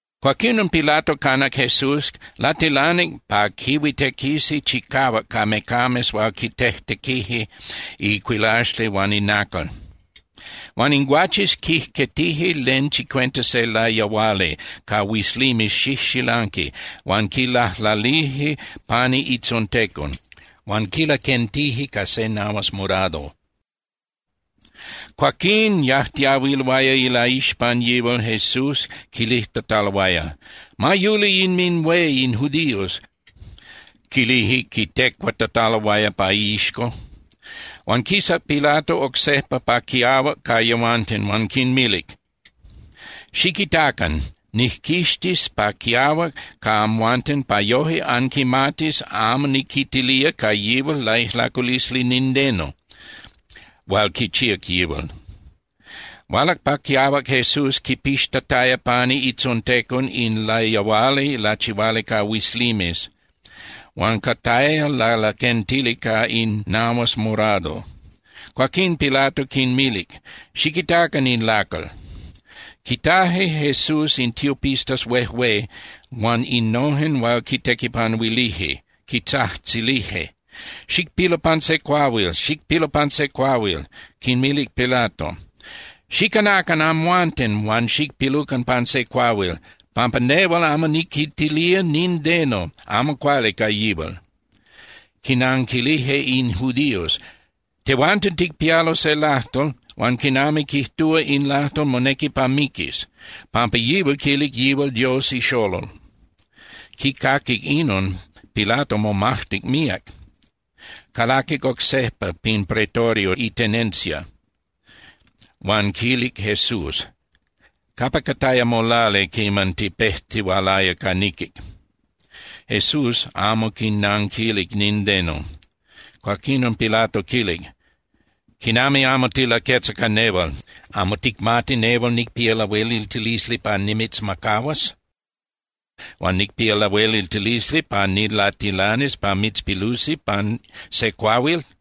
Cuaquinon, Pilato canac Jesús, latilanic pa quihuitequisi chicahuac ca mecames hual quitejtequije icuilaxli huan inacal. Huan in guaches quijquetije len chicuenta se layahuali ca huizlimes xijxilanqui huan quilajlalije pani itzontecon, huan quilaquentije ca se nahuas morado. Cuaquín yajtiahuiloaya ilaixpan yihual Jesús quilijtataloaya: —¡Ma yuli inminhué in judíos! —quilije quitecuatataloaya pa iixco. Huan quisac Pilato oc sejpa pa quiahuac ca yehuanten huan quinmilic: —Xiquitacan, nijquixtis pa quiahuac ca amhuanten pa yoje anquimatis amo niquitilía ca yihual laijlaculisli nindeno hual quichíac yihual. Hualac pa quiahuac Jesús quipixtataya pani itzontecon in layahuali lachihuali ca huizlimes huan cataya lalaquentili ca in nahuas morado. Cuaquín Pilato quinmilic: —¡Xiquitacan in lacal! Quitaje Jesús in tiopistas huejué huan innojen hual quintequipanuilije, quitzajtzilije: —¡Xicpilu pan se cuahuil! ¡Xicpilu pan se cuahuil! Quinmilic Pilato: —¡Xicanacan amhuanten huan xicpilucan pan se cuahuil! Pampa nehual amo niquitilía nindeno amo cuali ca yihual. Quinanquilije in judíos: —Tehuanten ticpialo se lajtol, huan quinami quijtúa in lajtol monequi pa miquis, pampa yihual quilic yihual Dios iXolol. Quicaquic inon, Pilato momajtic míac. Calaquic oc sejpa pin Pretorio itenencia, huan quilic Jesús: —¿Capa cataya molali quiman tipejtihualaya ca niquic? Jesús amo quinanquilic nindeno. Cuaquinon Pilato quilic: —¿Quinami amo tilaquetza ca nehual? ¿Amo ticmati nehual nicpía lahueliltilisli pa nimitzmacahuas, huan nicpía lahueliltilisli pa nilatilanis pa mitzpilusi pan se cuahuil?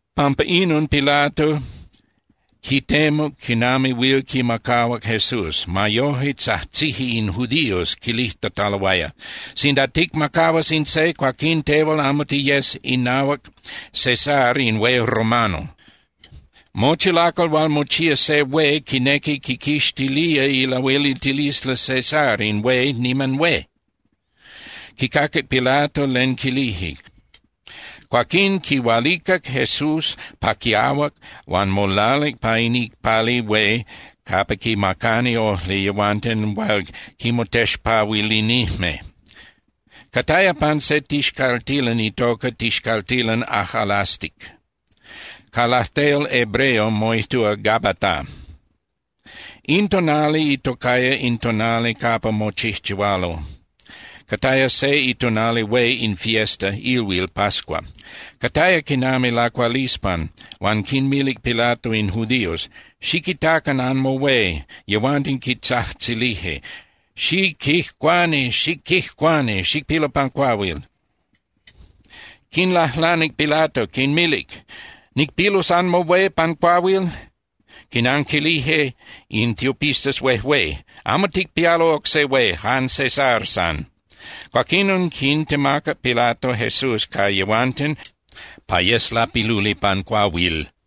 Pampa inon Pilato quitemuc quinami huil quimacahuac Jesús. Ma yoje, tzajtzije in judíos quilijtataloaya: —¡Sinda ticmacahuas in se, cuaquín tehual amo tiyes inahuac César in hué romano! ¡Mochi lacal hual mochía se hué quinequi quiquixtilía ilahueliltilisli César in hué niman hué! Quicaquic Pilato len quilije, cuaquín quihualicac Jesús pa quiahuac huan molalic pa in icpali hué capa quimacani ojli yehuanten hual quinmotexpahuilinijme. Cataya pan se tixcaltilan itocaya Tixcaltilan Ajꞌalastic. Ca lajtol hebreo moijtúa Gabata. In tonali itocaya In Tonali Capa Mochijchihualo, cataya se itonali hué in fiesta (ilhuil) pascua. Cataya quinami lacualispan huan quinmilic Pilato in judíos: —¡Xiquitacan anmohué! Yehuanten quitzajtzilije: —¡Xiquijcuani, xiquijcuani, xicpilu pan cuahuil! Quinlajlanic Pilato, quinmilic: —¿Nicpilus anmohué pan cuahuil? Quinanquilije in tiopistas huejué: —¡Amo ticpialo oc se hué, jan César san! Cuaquinon, quintemacac Pilato Jesús ca yehuanten pa yes lapiluli pan cuahuil.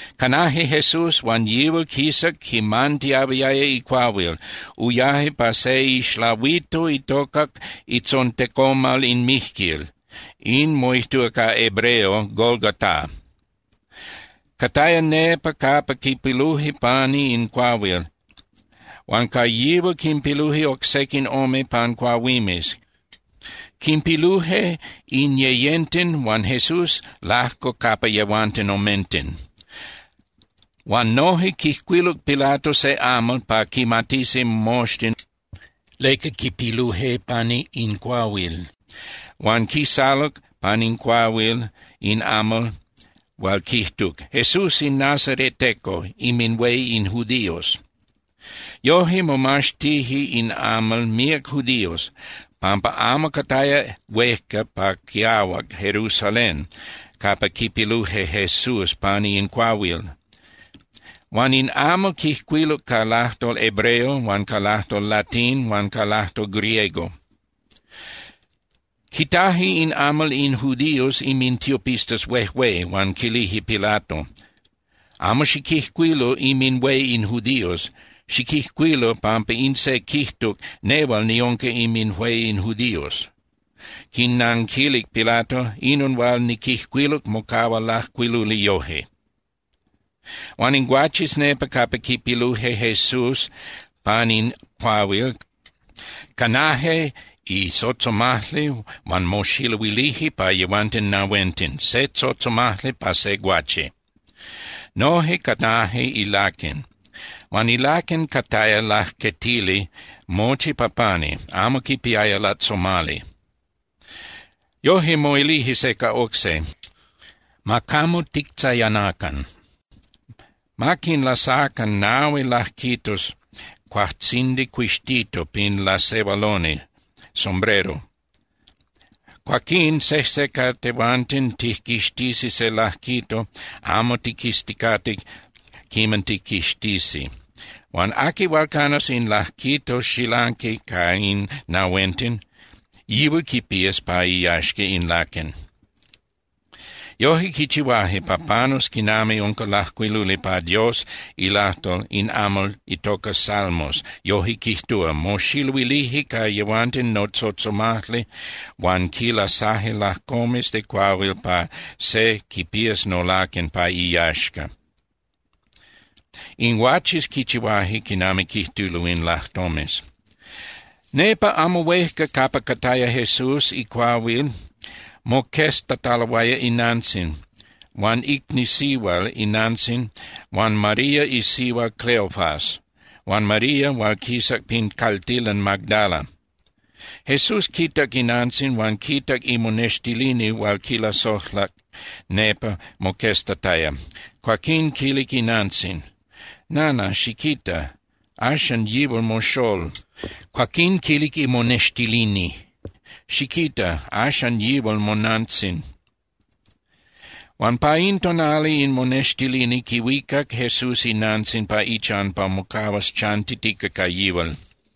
Canaje Jesús, huan yihual quisac quimantiahuiaya icuahuil, uyaje pa se ixlahuito itocac Itzontecomal in Mijquil, in moijtúa ca hebreo Golgotá. Cataya nepa capa quipiluje pani in cuahuil, huan ca yihual quinpiluje oc sequin ome pan cuahuimes, quinpiluje in yeyenten huan Jesús lajco capa yehuanten omenten. Huan noje quijcuiluc Pilato se amal pa quimatisi moxtin leca quipiluje pani in cuahuil, huan quisaluc pan in cuahuil in amal hual quijtuc: “JESÚS IN NAZARETECO, INMINHUÉ IN JUDÍOS.” Yoje, momaxtije in amal míac judíos, pampa amo cataya huejca pa quiahuac Jerusalén capa quipiluje Jesús pani in cuahuil. Huan in amal quijcuiluc ca lajtol hebreo huan ca lajtol latín huan ca lajtol griego. Quitaje in amal in judíos inmintiopistas huejué, huan quilije Pilato: —Amo xiquijcuilu “Inminhué in judíos”. Xiquijcuilu pampa in se quijtuc: “Nehual niunca inminhué in judíos.” Quinnanquilic Pilato: —Inon hual niquijcuiluc mocahua lajcuiluli yoje. Huan in guaches nepa capa quipiluje Jesús pan in cuahuil, canaje itzotzomajli huan moxiluilije pa yehuanten nahuenten, se tzotzomajli pa se guache. Noje canaje ilaquen. Huan ilaquen cataya lajquetili mochi pa pani, amo quipiaya lajtzomali. Yoje, moilije se ca oc se: —Ma camo tictzayanacan. Ma tiquinlasacan nahui lajquitos cuajtzindi cuixtito pin lasehualoni (sombrero), cuaquín sejse ca tehuanten tijquixtisi se lajquito amo tiquizticate quiman tijquixtisi. Huan aqui hual canas in lajquito xilanqui ca in nahuenten, yihual quipías pa iyaxca in laquen. Yoje quichihuaje pa panus quinami unca lajcuiluli pa Dios ilajtol, in Amal itoca Salmos, yoje quijtúa: “Moxiluilije ca yehuanten notzotzomajli huan quinlasaje lajcomes de cuahuil pa se quipías nolaquen pa iyaxca.” In guaches quichihuaje quinami quijtulo in lajtomes. Nepa amo huejca capa cataya Jesús icuahuil moqueztataloaya inantzin, huan icni sihual inantzin huan María isihua Cleofas, huan María hual quisac pin caltilan Magdala. Jesús quitac inantzin huan quitac imonextilini hual quilasojlac nepa moqueztataya. Cuaquín quilic inantzin: —Nana, xiquita. Axan yihual moxól. Cuaquín quilic imonextilini: —Xiquita. Axan yihual monantzin. Huan pa in tonali in monextilini quihuicac Jesús inantzin pa ichan pa mocahuas chantitica ca yihual.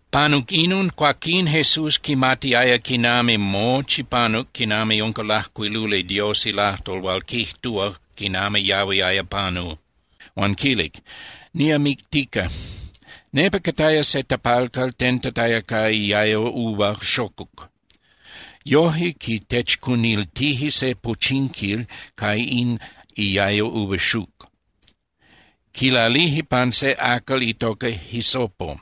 Panuc inon, cuaquín Jesús quimatiaya quinami mochi panuc quinami unca lajcuiluli Dios ilajtol hual quijtúa quinami yahuiaya panu. Huan quilic: —Niamictica. Nepa cataya se tapalcal tentataya ca iayo uva xocuc. Yoje quitechcuniltije se pochinquil ca in iayo uva xuc, quilalije pan se acal itoca hisopo,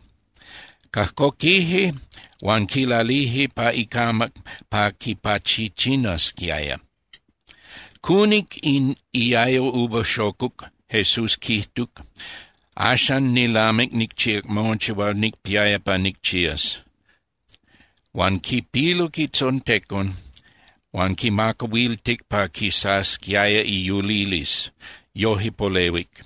cajcoquije huan quilalije pa icamac pa quipachichinasquiaya. Cunic in iayo uva xocuc, Jesús quijtuc: —Axan nilamic nicchíac mochi hual nicpiaya pa nicchías. Huan quipiluc itzontecon huan quimacahuiltic pa quisasquiaya iyulilisli, yoje polehuic.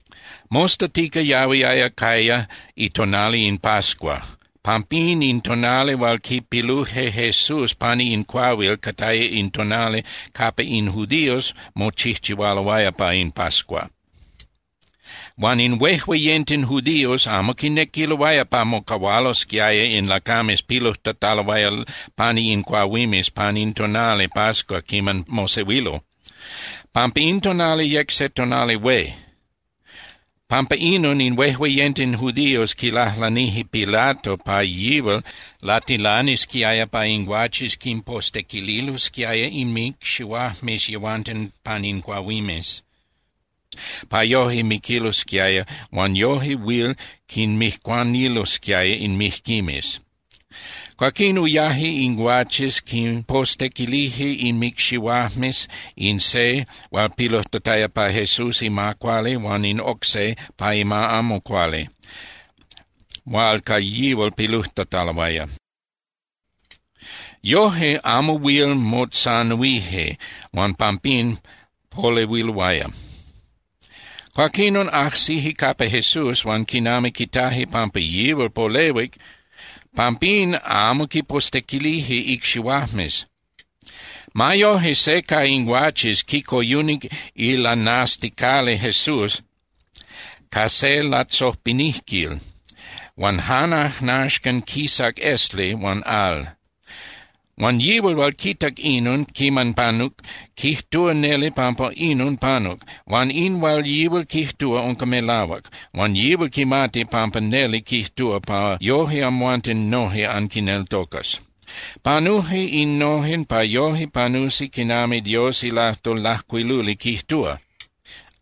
Mostatica yahuiaya caya itonali in pascua. Pampín, in tonali hual quipiluje Jesús pani in cuahuil cataya in tonali capa in judíos mochijchihualoaya pa in pascua. Huan in huejueyenten judíos amo quinequiloaya pa mocahualosquiaya in lacames pilujtataloaya pani in cuahuimes pan in tonali pascua quiman mosehuilo, pampa in tonali yec se tonali hué. Pampa inon, in huejueyenten judíos quilajlanije Pilato pa yihual latilanisquiaya pa in guaches quinpostequililosquiaya inmicxihuajmes yehuanten pan in cuahuimes, pa yoje miquilosquiaya huan yoje huil quinmijcuanilosquiaya in mijquimes. Cuaquín uyaje in guaches quinpostequilije inmicxihuajmes in se hual pilujtataya pa Jesús ima cuali huan in oc se pa ima amo cuali hual ca yihual pilujtataloaya. Yoje amo huil motzanuije huan pampín polehuiloaya. Cuaquinon, ajsije capa Jesús, huan quinami quitaje pampa yihual polehuic, pampín amo quipostequilije icxihuajmes. Ma yoje, se ca in guaches quicoyunic ilanasticali Jesús ca se latzopinijquil, huan jan ajnaxcan quisac esli huan al. Huan yihual hual quitac inon quiman panuc quijtúa neli pampa inon panuc, huan in hual yihual quijtúa unca melahuac, huan yihual quimati pampa neli quijtúa, pa yoje amhuanten noje anquineltocas. Panuje innojen pa yoje panusi quinami Dios ilajtol lajcuiluli quijtúa: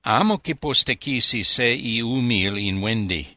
“Amo quipostequisi se iumil in huendi.”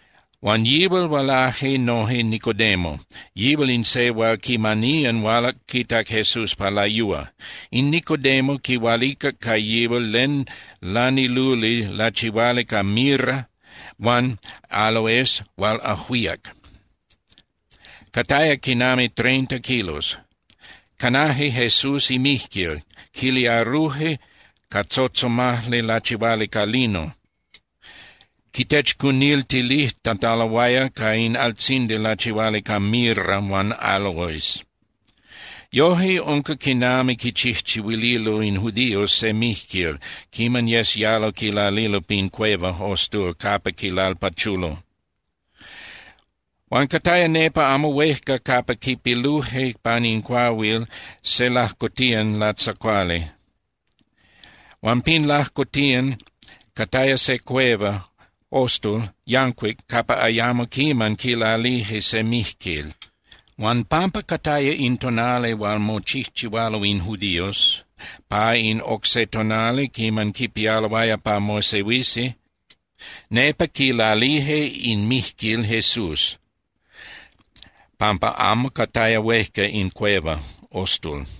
Huan yihual hualaje noje Nicodemo, yihual in se hual quimaniyan hualac quitac Jesús pa layúa. In Nicodemo quihualicac ca yihual len laniluli lachihuali ca mirra huan áloes hual ajuíac, cataya quinami treinta kilos. Canaje Jesús imijquil, quiliaruje ca tzotzomajli lachihuali ca lino, quitechcuniltilijtataloaya ca in altzindi lachihuali ca mirra huan áloes. Yoje unca quinami quichijchihuililo in judíos se mijquil quiman yes yalo quilalilo pin cueva (ostul) capa quilalpachulo. Huan cataya nepa amo huejca capa quipiluje pan in cuahuil se lajcotiyan latzacuali, huan pin lajcotiyan cataya se cueva (ostul) yancuic capa ayamo quiman quilalije se mijquil. Huan pampa cataya in tonali hual mochijchihualo in judíos pa in oc se tonali quiman quipialoaya pa mosehuisi, nepa quilalije in mijquil Jesús pampa amo cataya huejca in cueva (ostul).